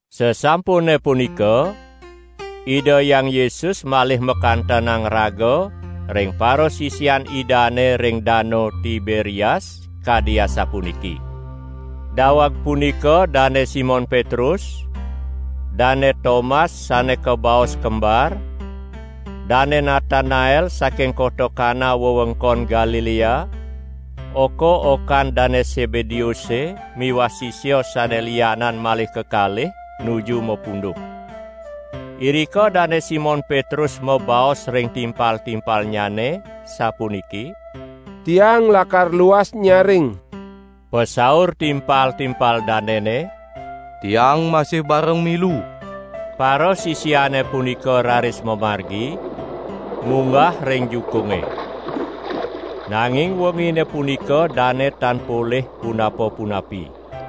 Sasampune punika, Ida Hyang Yesus malih makantenang raga ring parasisian Idane ring Danu Tiberias kadi asapuniki. Daweg punika Dane Simon Petrus, Dane Tomas (sane kabaos Kembar), Dane Natanael (saking kota Kana wewengkon Galilea), oka-okan Dane Sebedeuse miwah sisia sane lianan malih kekalih nuju mapunduh. Irika Dane Simon Petrus mabaos ring timpal-timpalnyane sapuniki: "Tiang lakar luas nyaring!" Pasaur timpal-timpal danene: "Tiang masih bareng milu!" Parasisiane punika raris mamargi, munggah ring jukunge. Nanging wengine punika dane tan polih punapa-punapi.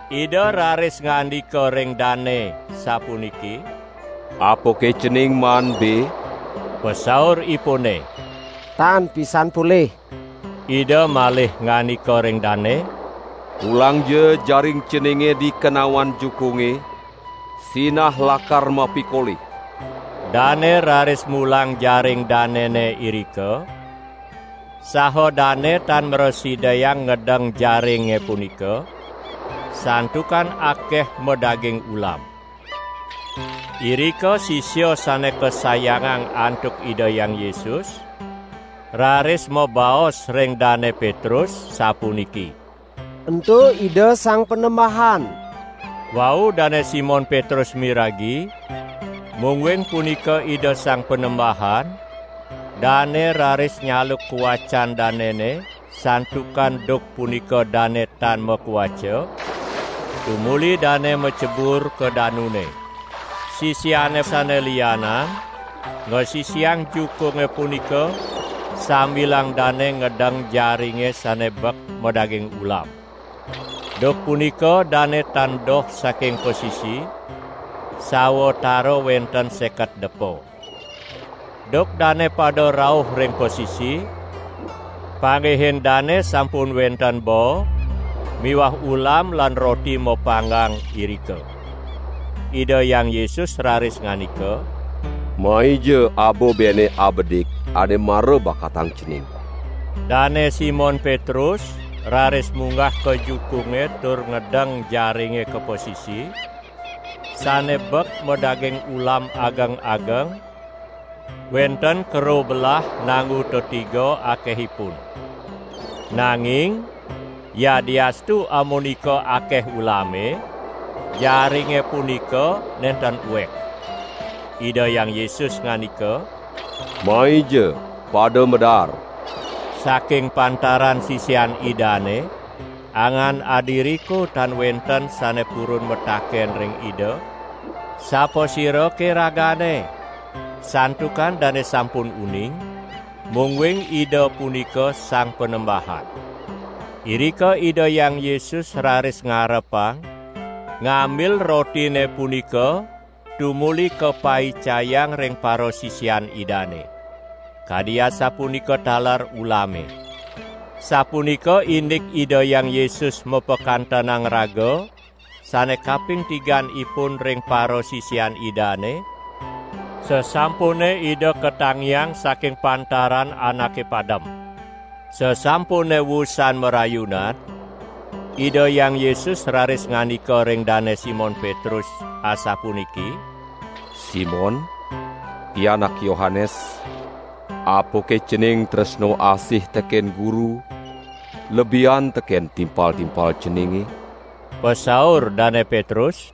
Ida raris ngandika ring dane sapuniki: "Apake cening maan be?" Pasauripune: "Tan pisan polih!" Ida malih ngandika ring dane: "Pulangja jaring ceninge di kenawan jukunge, sinah lakar mapikolih!" Dane raris mulang jaring danene irika, saha dane tan mrasidayang ngedeng jaringe punika, santukan akeh madaging ulam. Irika sisia sane kasayangang antuk Ida Hyang Yesus raris mabaos ring Dane Petrus sapuniki: "Ento Ida Sang Panembahan!" Wau Dane Simon Petrus miragi mungguing punika Ida Sang Panembahan, dane raris nyaluk kawacan danene (santukan duk punika dane tan makawaca), tumuli dane macebur ka danune. Sisiane sane lianan ngasisiang jukunge punika sambilang dane ngedeng jaringe sane bek madaging ulam. Duk punika dane tan doh saking pasisi, sawatara wenten seket depa. Duk dane pada rauh ring pasisi, panggihin dane sampun wenten baa miwah ulam lan roti mapanggang irika. Ida Hyang Yesus raris ngandika: "Maija aba bene abedik ane mara bakatang cening!" Dane Simon Petrus raris munggah ka jukunge tur ngedeng jaringe ka pasisi, sane bek madaging ulam ageng-ageng, wenten karobelah nanggu tetiga akehipun. Nanging yadiastu amunika akeh ulame, jaringe punika nenten uek. Ida Hyang Yesus ngandika: "Maija pada madaar!" Saking pantaran sisian Idane angan adiriko tan wenten sane purun mataken ring Ida: "Sapasirake Ragane?" santukan dane sampun uning, mungguing Ida punika Sang Panembahan. Irika Ida Hyang Yesus raris ngarepang, ngambil rotine punika tumuli kapaicayang ring parasisian Idane. Kadi asapunika taler ulame. Sapunika indik Ida Hyang Yesus mapakantenang raga sane kaping tiganipun ring parasisian Idane, sasampune Ida katangiang saking pantaran anake padem. Sasampune wusan marayunan, Ida Hyang Yesus raris ngandika ring Dane Simon Petrus asapuniki: "Simon, pianak Yohanes, apake cening tresna asih teken Guru lebihan teken timpal-timpal ceninge?" Pasaur Dane Petrus: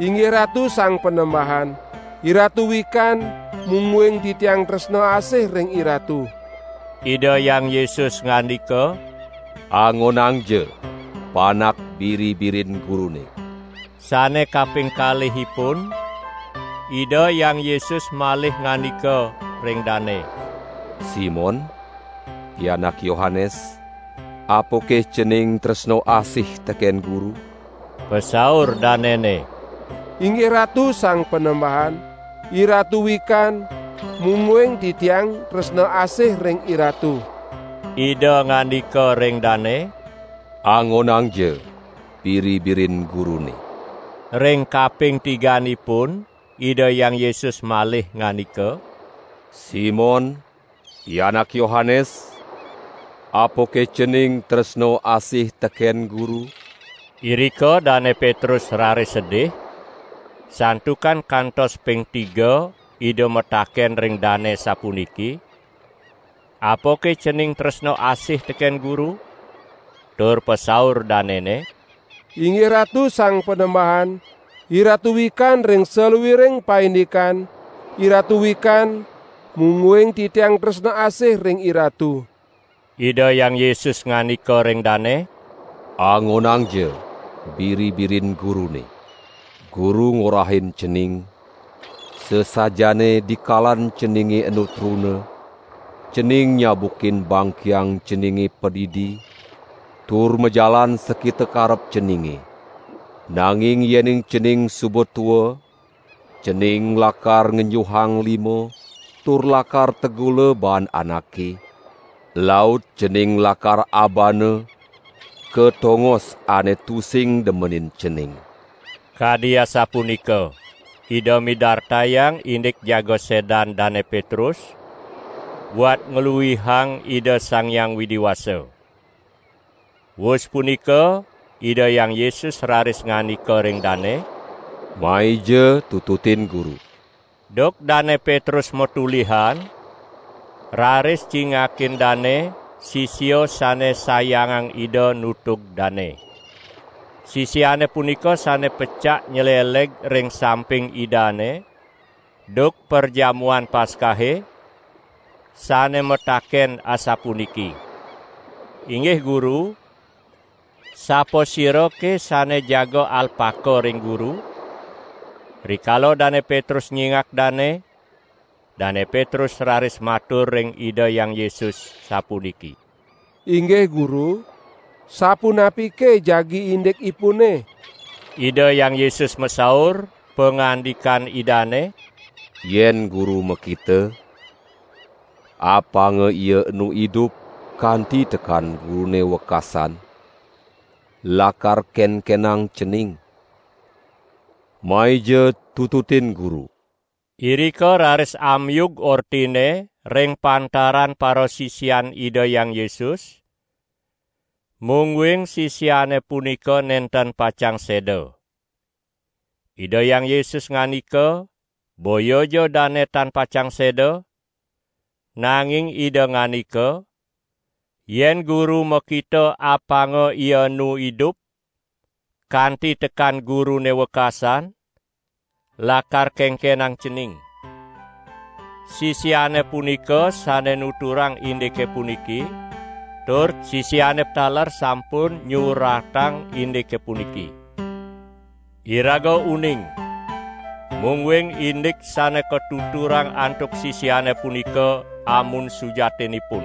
"Inggih Ratu Sang Panembahan, IRatu wikan mungguing titiang tresna asih ring IRatu." Ida Hyang Yesus ngandika: "Angonangja panak biri-birin Gurune!" Sane kaping kalihipun Ida Hyang Yesus malih ngandika ring dane: "Simon pianak Yohanes, apake cening tresna asih teken Guru?" Pasaur danene: "Inggih Ratu Sang Panembahan, IRatu wikan, mungguing titiang tresna asih ring IRatu!" Ida ngandika ring dane: "Angonangja biri-birin Gurune." Ring kaping tiganipun Ida Hyang Yesus malih ngandika: "Simon, pianak Yohanes, apake cening tresna asih teken Guru?" Irika Dane Petrus raris sedih, santukan kantos ping tiga Ida mataken ring dane sapuniki: "Apake cening tresna asih teken Guru?" Tur pasaur danene: "Inggih Ratu Sang Panembahan, IRatu wikan ring saluiring paindikan; IRatu wikan mungguing titiang tresna asih ring IRatu!" Ida Hyang Yesus ngandika ring dane: "Angonangja biri-birin Gurune! Guru ngorahin cening, sasajaane dikalan ceninge enu truna, cening nyabukin bangkiang ceninge padidi tur majalan sakita karep ceninge, nanging yening cening suba tua, cening lakar ngenjuhang lima tur lakar tegula baan anake, laut cening lakar abana ka tongos ane tusing demenin cening." (Kadi asapunika Ida midartayang indik jaga sedan Dane Petrus buat ngluihang Ida Sang Hyang Widi Wasa.) Wus punika Ida Hyang Yesus raris ngandika ring dane: "Maija tututin Guru!" Duk Dane Petrus matolihan raris cingakin dane sisia sane sayangang Ida nutug dane. Sisiane punika sane pecak nyleleg ring samping Idane duk Perjamuan Paskahe, sane mataken asapuniki: "Inggih Guru, sapasirake sane jaga alpaka ring Guru?" Rikala Dane Petrus nyingak dane, Dane Petrus raris matur ring Ida Hyang Yesus sapuniki: "Inggih Guru, sapunapike jagi indikipune?" Ida Hyang Yesus masaur, pangandikan Idane: "Yen Guru makita, apanga ia enu idup kanti tekan Gurune wekasan, lakar kenkenang cening? Maija tututin Guru!" Irika raris amiug ortine ring pantaran parasisian Ida Hyang Yesus, mungguing sisiane punika nenten pacang seda. Ida Hyang Yesus ngandika boyaja dane tan pacang seda, nanging Ida ngandika: "Yen Guru makita apanga ia enu idup kanti tekan Gurune wekasan, lakar kenkenang cening?" Sisiane punika sane nuturang indike puniki, tur sisiane taler sampun nyuratang indike puniki. Iraga uning, mungguing indik sane katuturang antuk sisiane punika amun sujatinipun.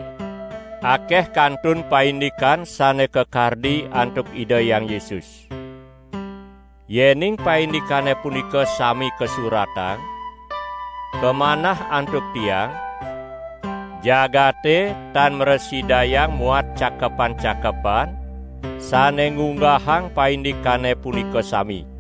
Akeh kantun paindikan sane kakardi antuk Ida Hyang Yesus. Yening paindikane punika sami kasuratang, kamanah antuk tiang, jagate tan mrasidayang muat cakepan-cakepan sane ngunggahang paindikane punika sami.